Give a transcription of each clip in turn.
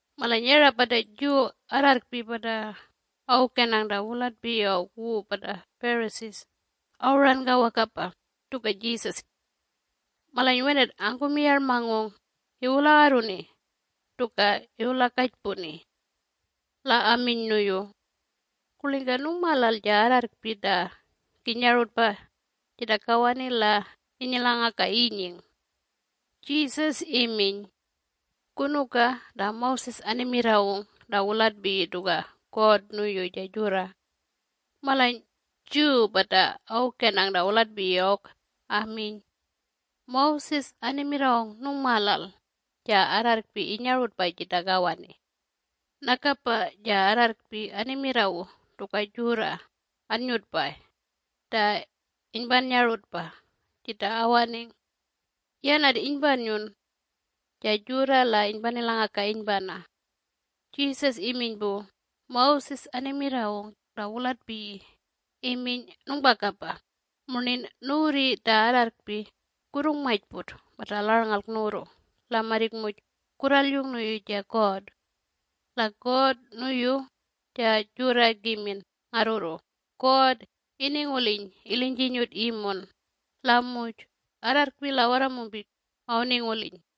Malany yara pata Jew arrarrkpi pata awukenang ta wulatpiyi awk wu pata Pharisees awuranka wakapa tuka Jesus. Malany wenat angkumiyarmangung iwulagarruni tuka iwulakajpuni. La aminy nuyu, “Kurlingka nungmalal ja arrarrkpi ta innyarutpay jita kawani la innyilangakay inying?” Jesus iminy, “Kunuka ta Moses animirrawung ta wulatpiyi tuka God nuyu ja jurra?” Malany Jew pata awukenang ta wulatpiyi awk aminy, “Moses animirrawung nungmalal ja arrarrkpi inyarutpay jita kawani. Nakapa ja arrarrkpi animirrawu tuka jurra annyutpay ta inypannyarutpa jita awaning. Yanat inypannyun ja jurra la inypanilangaka inypana.” Jesus iminy pu, “Moses animirrawung ta wulatpiyi iminy nungpakapa murnin nuwurri ta arrarrkpi kurrungmajput mata larlngalk nuwurru la marrik muj kurralyung nuyu ja God. La God nuyu ja jurra kimin ngarrurru God ininguliny ilinyjinyut imun la muj arrarrkpi la warramumpik awuninguliny.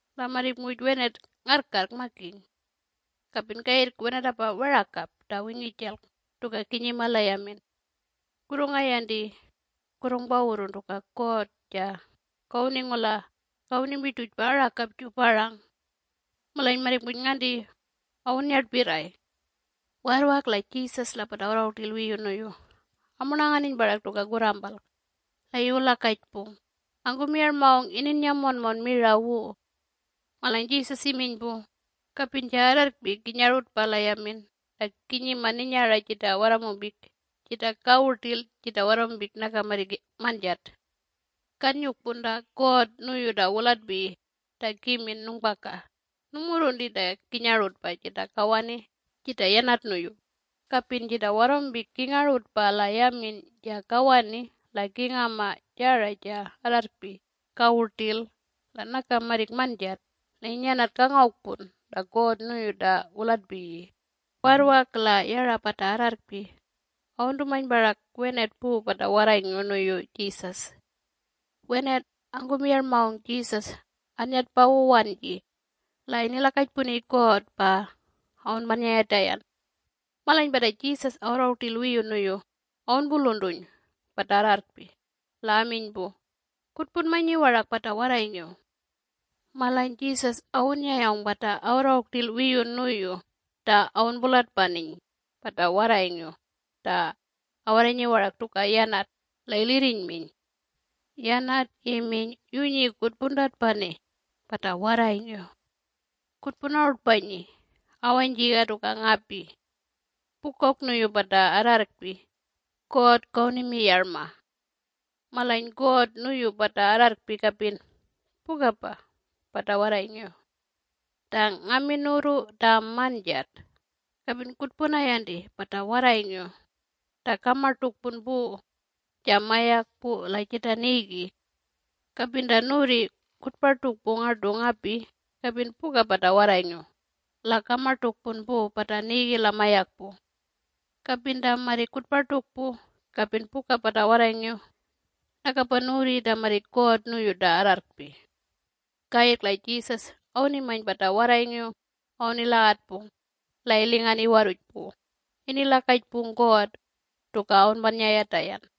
La marrik muj wenat ngarrkarrk makiny. Kapin kayirrk wenatapa werakap ta wingijalk tuka kinyima la yamin. Kurrungayanti kurrungpawurrun tuka God ja kawuningula kawunimirtujpa arakapju parang, malany marrik muj nganti awunnyartpirray.” Warrwak la Jesus la pata awarrangung rtil wiyu nuyu amurnanganiny parak tuka kurrampalk la iwulakajpung angkumiyarmangung ininyang monmon mira wu. Malany Jesus iminy pu, “Kapin ja arrarrkpi kinyarutpa la yamin la kinyima ninyara jita warramumpik, jita kawu rtil jita warramumpik naka marrik manjat. Kannyukpun ta God nuyu ta wulatpiyi ta kimin, nungpaka nungmurrunti ta kinyarutpa jita kawani jita yanat nuyu. Kapin jita warramumpik kingarutpa la yamin ja kawani la kingama jara ja arrarrkpi kawu rtil la naka marrik manjat la inyanat kangowkpun ta God nuyu ta wulatpiyi.” Warrwak la yara pata arrarrkpi awuntumany parak wenat pu pata warrayngiw nuyu Jesus. Wenat angkumiyarmangung Jesus annyatpa wu wanji la inilakajpuni God pa awunpannyayatayan. Malany pata Jesus awarrangung rtil wiyu nuyu awunpuluntuny pata arrarrkpi la aminy pu, “Kutpunmanyi warak pata warrayngiw.” Malany Jesus awunnyayawng pata awarrangung rtil wiyu nuyu ta awunpulatpaniny pata warrayngiw ta awarranyi warak tuka yanat la ilirrinyminy. Yanat iminy, “Yunyi kutpuntatpani pata warrayngiw! Kutpunarutpanyi awanyjiga tuka ngapi! Pukawk nuyu pata arrarrkpi God kawunimiyarma. Malany God nuyu pata arrarrkpi kapin pukapa pata warrayngiw. Ta ngamin nuwurru ta manjat, kapin kutpunayanti pata warrayngiw ta kamartukpun pu ja mayakpu la jita nigi. Kapin ta nuwurri kutpartukpu ngartu ngapi kapin puka pata warrayngiw la kamartukpun pu pata nigi la mayakpu. Kapin ta marrik kutpartukpu kapin puka pata warrayngiw nakapa nuwurri ta marrik God nuyu ta arrarrkpi.” Kayirrk la Jesus awunimany pata warrayngiw awunilagatpung la ilingan iwarruj pu inilakajpung God tuka awunpannyayatayan.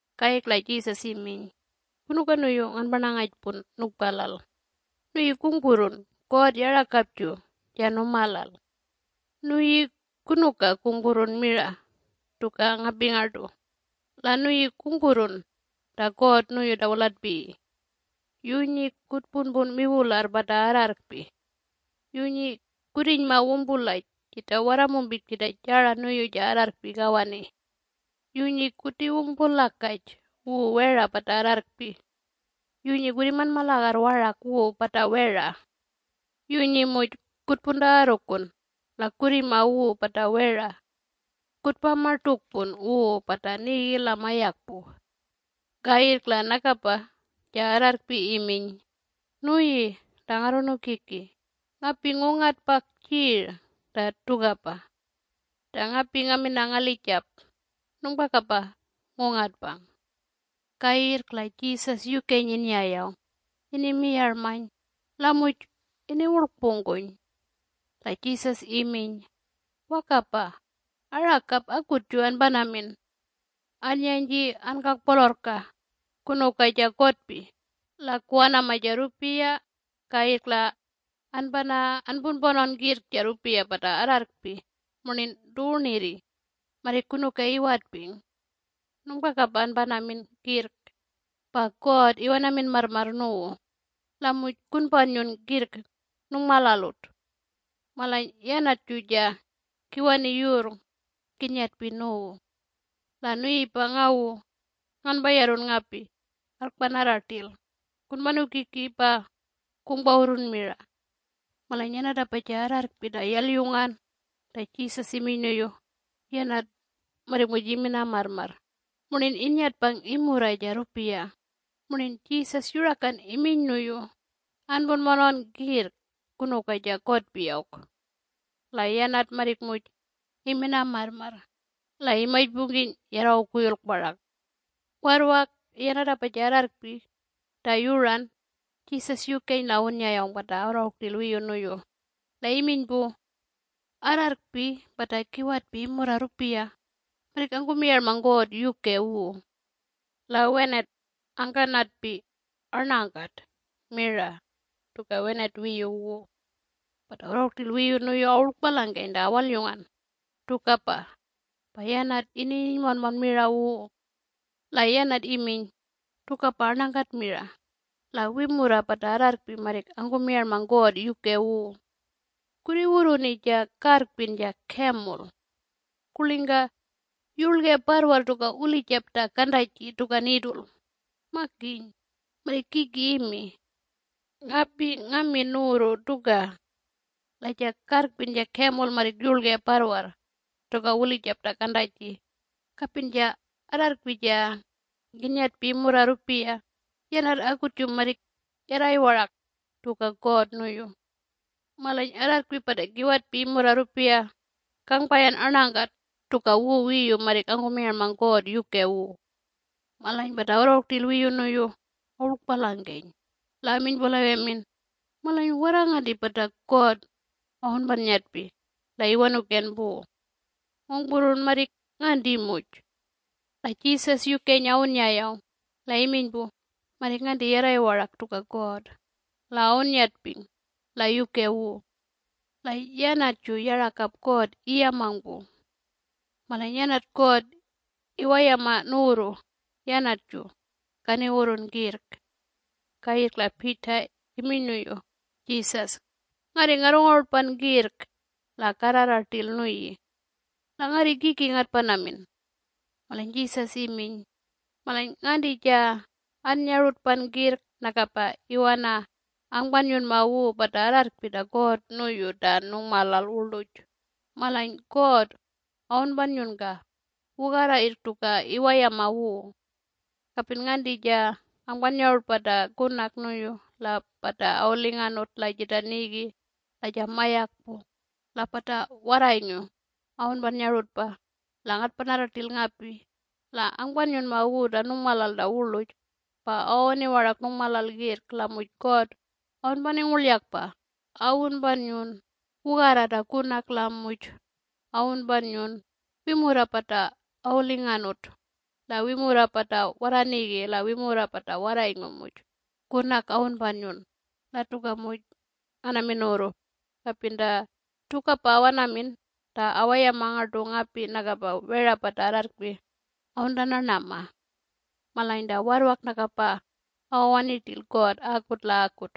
Kayirrk la Jesus iminy, “Kunuka nuyu nganparnangajpun, ‘nukpalal?’ Nuyi kungpurrun God yarakapju ja numalal. Nuyi kunuka kungpurrun mira tuka ngapi ngartu? la nuyi kungpurrun ta God nuyu ta wulatpiyi. Yunyi kutpunpun wiwularr pata arrarrkpi. Yunyi kurrinyma wumpulaj jita warramumpik jita jara nuyu ja arrarrkpi kawani. Yunyi kutiwumpulakaj wu wera pata arrarrkpi. Yunyi kurrimanmalagarr warak wu pata wera. Yunyi muj kutpuntagarrukun la kurrima wu pata wera. Kutpamartukpun wu pata nigi la mayakpu.” Kayirrk la nakapa ja arrarrkpi iminy, “Nuyi ta Ngarrunukiki ngapi ngungatpakjir ta tukapa. Ta ngapi ngaminang ngalijap nungpakapa ngungatpang.” Kayirrk la Jesus yukeny innyayawng inimiyarmany la muj iniwurlkpungkuny. La Jesus iminy, “Wakapa arakap akutju anpanamin. Annyanyji ankakpolorrka kunuka ja kotpi la kuwanama ja rrupiya kayirrk la anpana anpunpanawn kirrk ja rrupiya pata arrarrkpi murnin tuwunirri marrik kunuka iwatping. Nungpakapa anpanamin kirrk, pa God iwanamin marrmarr nuwu la muj kunpannyun kirrk nungmalalut. Malany yanatju ja kiwani yurrng kinnyatpi nuwu. La nuyipa, ngawu nganpayarrun ngapi arrkpanarra rtil kunpanukiki pa kungpawurrun mira.” Malany yanatpa ja arrarrkpi ta yalyungan ta Jesus iminy nuyu yanat marrik muj imina marrmarr murnin innyatpang imurra ja rrupiya murnin Jesus yurakan iminy nuyu, “Anpunpanawn kirrk kunuka ja kotpi awk.” La yanat marrik muj imina marrmarr la imajpungkiny yarrangung kuyulk parak. Warrwak yanatapa ja arrarrkpi ta yuran Jesus yukeny la awunnyayawng pata awarrangung rtil wiyu nuyu la iminy pu, “Arrarrkpi pata kiwatpi imurra rrupiya marrik angkumiyarmang God yuke wu. La wenat angkanatpi arnangkat mira tuka wenat wiyu wu.” Pata awarrangung rtil wiyu nuyu awurlkpalangkeny ta awalyungan tukapa pa yanat inininy monmon mira wu. La yanat iminy, “Tukapa arnakat mira la wimurra pata arrarrkpi marrik angkumiyarmang God yuke wu. Kurriwurruni ja karrpin ja camel. Kurlingka yurlge parrwarr tuka wulijap ta kantaji tuka needle? Makiny marrik kiki imi. Ngapi ngamin nuwurru tuka. La ja karrkpin ja camel marrik yurlge parrwarr tuka wulijap ta kantaji kapin ja arrarrkpi ja kinnyatpi imurra rrupiya yanat akutju marrik yarray warak tuka God nuyu. Malany arrarrkpi pata kiwatpi imurra rrupiya kangpayan arnangkat tuka wu wiyu marrik angkumiyarmang God yuke wu.” Malany pata awarrangung rtil wiyu nuyu awurlkpalangkeny la aminy pu la wemin, “Malany warra nganti pata God awunpannyatpi la iwanuken pu? Ngungpurrun marrik nganti muj!” La Jesus yukeny awunnyayawng la iminy pu, “Marrik nganti yarray warak tuka God la awunnyatping la yuke wu. La yanatju yarakap God iyamang pu. Malany yanat God iwayama nuwurru yanatju kaniwurrun kirrk.” Kayirrk la Peter iminy nuyu Jesus, “Ngarri ngarrungarutpan kirrk la karrarra rtil nuyi. La ngarri kiki ngatpanamin?” Malany Jesus iminy, “Malany nganti ja annyarutpan kirrk nakapa iwana angpannyunma wu pata arrarrkpi ta God nuyu ta nungmalal wurluj malany God awunpannyunka wugarra yirrk tuka iwayama wu. Kapin nganti ja angpannyarutpa ta kunak nuyu la pata awulinganut la jita nigi la ja mayakpu la pata warrayngiw awunpannyarutpa la ngatpanarra rtil ngapi la angpannyunma wu ta nungmalal ta wurluj pa awawani warak nungmalal kirrk la muj God awunpaningurlyakpa awunpannyun wugarra ta kunak la muj awunpannyun wimurra pata awulinganut la wimurra pata warra nigi la wimurra pata warrayngiw muj kunak awunpannyun. La tuka muj nganamin nuwurru, kapin ta tukapa awanamin ta awayama ngartu ngapi nakapa wera pata arrarrkpi awuntanarnama. Malany ta warrwak nakapa awawani rtil God akut la akut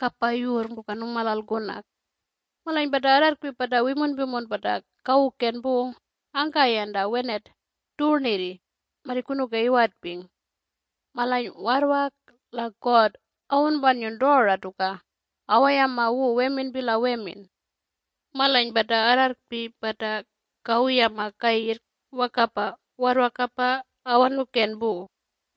kapa yurrng tuka nungmalal kunak. Malany pata arrarrkpi pata wimunpimun pata kawuken pu angkayan ta wenat tuwurnirri marrik kunuka iwatping. Malany warrwak la God awunpannyun tora tuka awayama wu weminpi la wemin. Malany pata arrarrkpi pata kawuyama kayirrk wakapa warrwakapa awanuken pu.”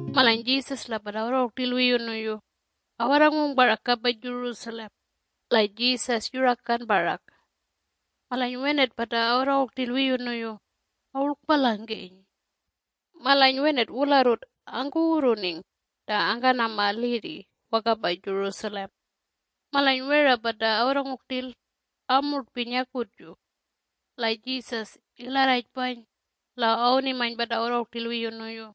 Malany Jesus la pata awarrangung rtil wiyu nuyu awarrangung parak kapa Jerusalem la Jesus yurakan parak. Malany wenat pata awarrangung rtil wiyu nuyu awurlkpalangkeny. Malany wenat wularrut angkuwurruning ta angkanama lirri wakapa Jerusalem. Malany wera pata awarrangung rtil amurtpiny akutju. La Jesus ilarrajpany la awunimany pata awarrangung rtil wiyu nuyu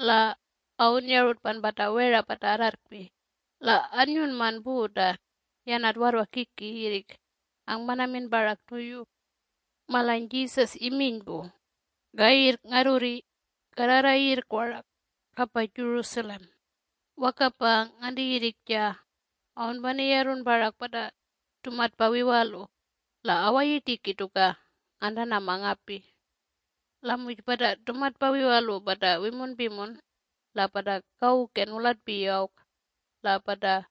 la awunnyarutpan pata wera pata arrarrkpi la annyunman pu ta yanat warrwak kiki yirrik angpanamin parak nuyu. Malany Jesus iminy pu, “Kayirrk ngarrurri karrarra yirrk warak kapa Jerusalem wakapa nganti yirrik ja awunpaniyarrun parak pata tumatpa wiwalu la awayirtiki tuka ngantanama ngapi. La muj pata tumatpa wiwalu pata wimunpimun la pata kawuken wulatpiyi awk la pata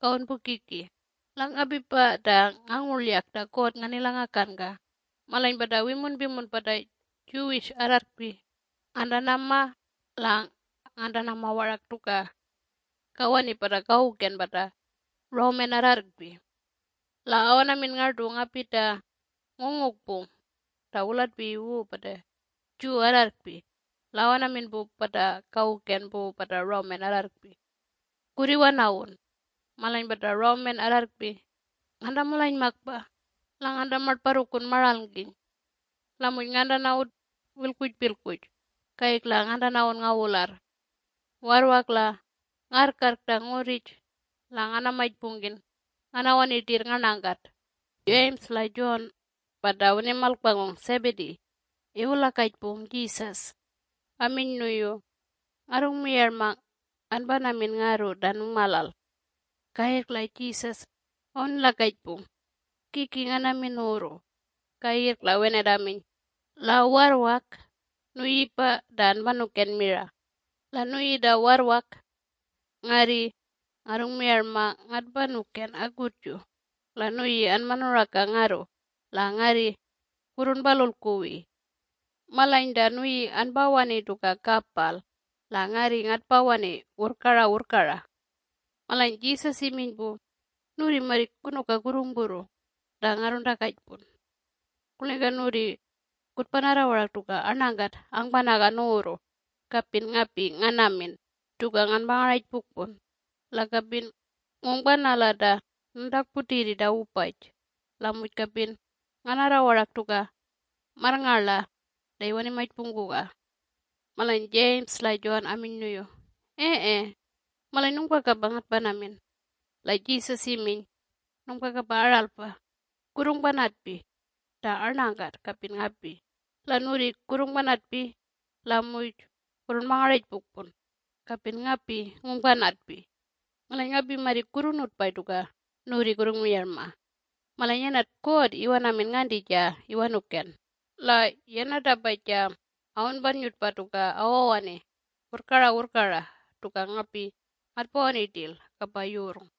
kawunpukiki. La ngapipa ta ngangurlyak ta God nganilangakanka. Malany pata wimunpimun pata Jew arrarrkpi ngantanama la ngantanama warak tuka kawani pata kawuken pata Roman arrarrkpi. La awanamin ngartu ngapi ta ngungukpung ta wulatpiyi wu pata Jew arrarrkpi la awanamin pu pata kawuken pu pata Roman arrarrkpi, “Kurriwanawun.” Malany pata Roman arrarrkpi ngantamalanymakpa la ngantamarnparrukun maralngkiny. La muj ngantanawun wilkpujpilkpuj kayirrk la ngantanawun ngawularr. Warrwak la ngarrkarrk ta ngurrij la nganamajpungkin nganawani rtirr ngarnakat.” James la John (pata awunimalkpangung Zebedee) iwulakajpung Jesus aminy nuyu, “Ngarrungmiyarma anpanamin ngarru ta nungmalal.” Kayirrk la Jesus awunilakajpung, “Kiki nganamin nuwurru?” Kayirrk la wenat aminy, “La warrwak nuyipa ta anpanuken mira. La nuyi ta warrwak ngarri ngarrungmiyarma ngatpanuken akutju la nuyi anpanuraka ngarru la ngarri kurrunpalulkuwi. Malany ta nuyi anpawani tuka kapal la ngarri ngatpawani wurrkara wurrkara.” Malany Jesus iminy pu, “Nuwurri marrik kunuka kurrungpurru ta ngarruntakajpun. Kurlingka nuwurri kutpanarra warak tuka arnangkat angpanaga nuwurru kapin ngapi nganamin? Tuka nganpangarajpukpun-la kapin ngungpanala ta nuntakputirri ta wupaj, la muj kapin nganarra warak tuka marrngarla ta iwanimajpungkuga.” Malany James la John aminy nuyu, “Ee! Malany nungpakapa ngatpanamin.” La Jesus iminy, “Nungpakapa aralpa! Kurrungpanatpi ta arnakat kapin ngapi, la nuwurri kurrungpanatpi la muj kurrungpangarajpukpun kapin ngapi ngungpanatpi.” Malany ngapi marrik kurrunutpay tuka nuwurri kurrungmiyarma. Malany yanat God iwanamin nganti ja iwanuken, la yanatapa ja awunpannyutpa tuka awawani wurrkara wurrkara tuka ngapi ngatpawani rtil kapa yurrng.”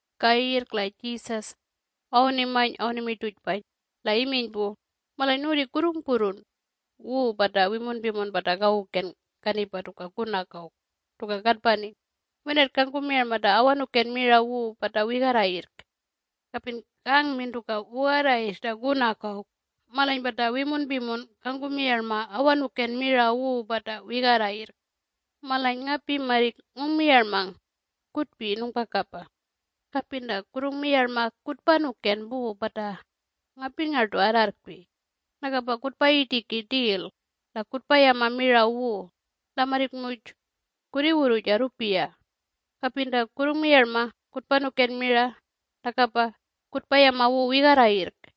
Kayirrk la Jesus awunimany awunimirtujpany la iminy pu, “Malany nuwurri kurrungpurrun wu pata wimunpimun pata kawuken kanipa tuka kunak awk tuka katpani wenat kangkumiyarma ta awanuken mira wu pata wigarra yirrk. Kapin kangmin tuka wugarra yirrk ta kunak awk malany pata wimunpimun kangkumiyarma awanuken mira wu pata wigarra yirrk. Malany ngapi marrik ngungmiyarmang kutpi nungpakapa. Kapin ta kurrungmiyarma kutpanuken pu pata ngapi ngartu arrarrkpi nakapa kutpayirtiki rtil la kutpayama mira wu la marrik muj kurriwurru ja rrupiya. Kapin ta kurrungmiyarma kutpanuken mira nakapa kutpayama wu wigarra yirrk.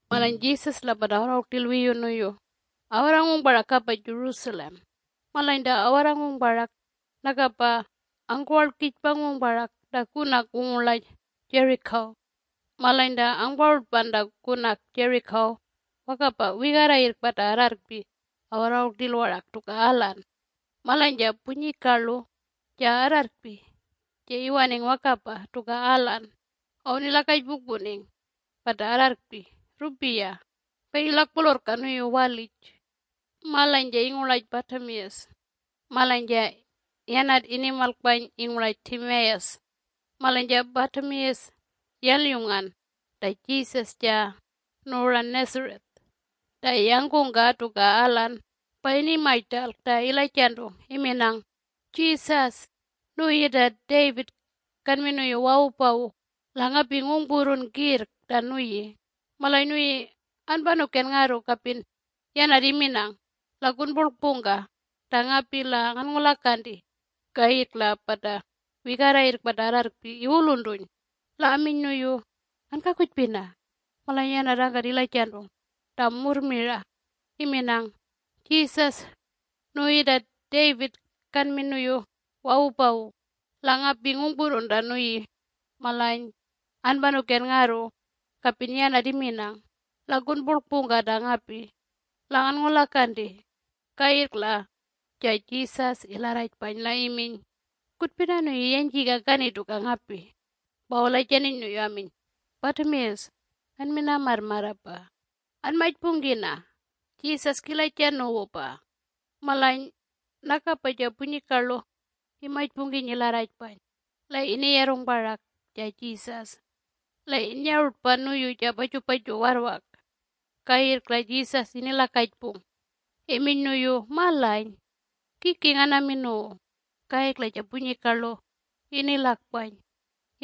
Malany Jesus la pata awarrangung rtil wiyu nuyu awarrangung parak kapa Jerusalem, malany ta awarrangung parak nakapa angkuwarlkijpangung parak ta kunak wungurlaj Jericho. Malany ta angparutpan ta kunak Jericho wakapa wigarra yirrk pata arrarrkpi awarrangung rtil warak tuka alan. Malany ja punyikarlu ja arrarrkpi ja iwaning wakapa tuka alan awunilakajpukpuning pata arrarrkpi rrupiya pa ilakpolorrka nuyu walij. Malany ja ingurlaj Bartimaeus, (malany ja yanat inimalkpany ingurlaj Timaeus.) Malany ja Bartimaeus yalyungan ta Jesus ja nuwuran Nazareth, ta yangkungka tuka alan, pa inimajrtalk ta ilajantung iminang, “Jesus nuyi ta David kanmin nuyu wawupawu la ngapi ngungpurrun kirrk ta nuyi, malany nuyi anpanuken ngarru kapin yanat iminang. La kunpurlkpungka ta ngapi la nganngulakanti!” Kayirrk la pata wigarra yirrk pata arrarrkpi iwuluntuny la aminy nuyu, “Ankakujpina!” Malany yanat angkat ilajantung ta murr mirayu iminang, “Jesus nuyi ta David kanmin nuyu wawupawu la ngapi ngungpurrun ta nuyi malany anpanuken ngarru kapin yanat iminang. La kunpurlkpungka ta ngapi la nganngulakanti!” Kayirrk la ja Jesus ilarrajpany la iminy, “Kutpina nuyu yanyjiga kani tuka ngapi.” Pa awulajantiny nuyu aminy, “Batimaeus, anmina marrmarrapa. Anmajpungkina! Jesus kilaja nuwupa!” Malany nakapa ja punyikarlu imajpungkiny ilarrajpany la iniyarrung parak ja Jesus. La innyarutpan nuyu ja pajupaju warrwak. Kayirrk la Jesus inilakajpung iminy nuyu, “Malany? Kiki nganamin nuwu?” Kayirrk la ja punyikarlu inilakpany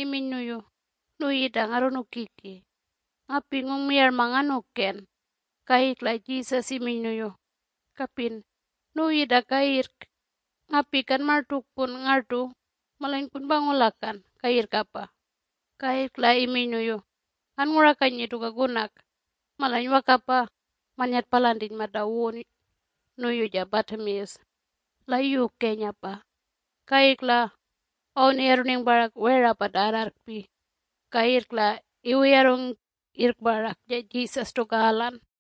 iminy nuyu, “Nuyi ta Ngarrunukiki, ngapi ngungmiyarma nganukan!” Kayirrk la Jesus iminy nuyu, “Kapin nuyi ta kayirrk ngapi kanmartukpun ngartu malany kunpangulakan kayirrkapa”. Kayirrk la iminy nuyu, “Anngurakanyi tuka kunak.” Malany wakapa mannyatpalantiny mata wun nuyu ja Bartimaeus la yukenyapa, kayirrk la awuniyarruning parak wera pata arrarrkpi kayirrk la iwuyarrung yirrk parak ja Jesus tuka alan.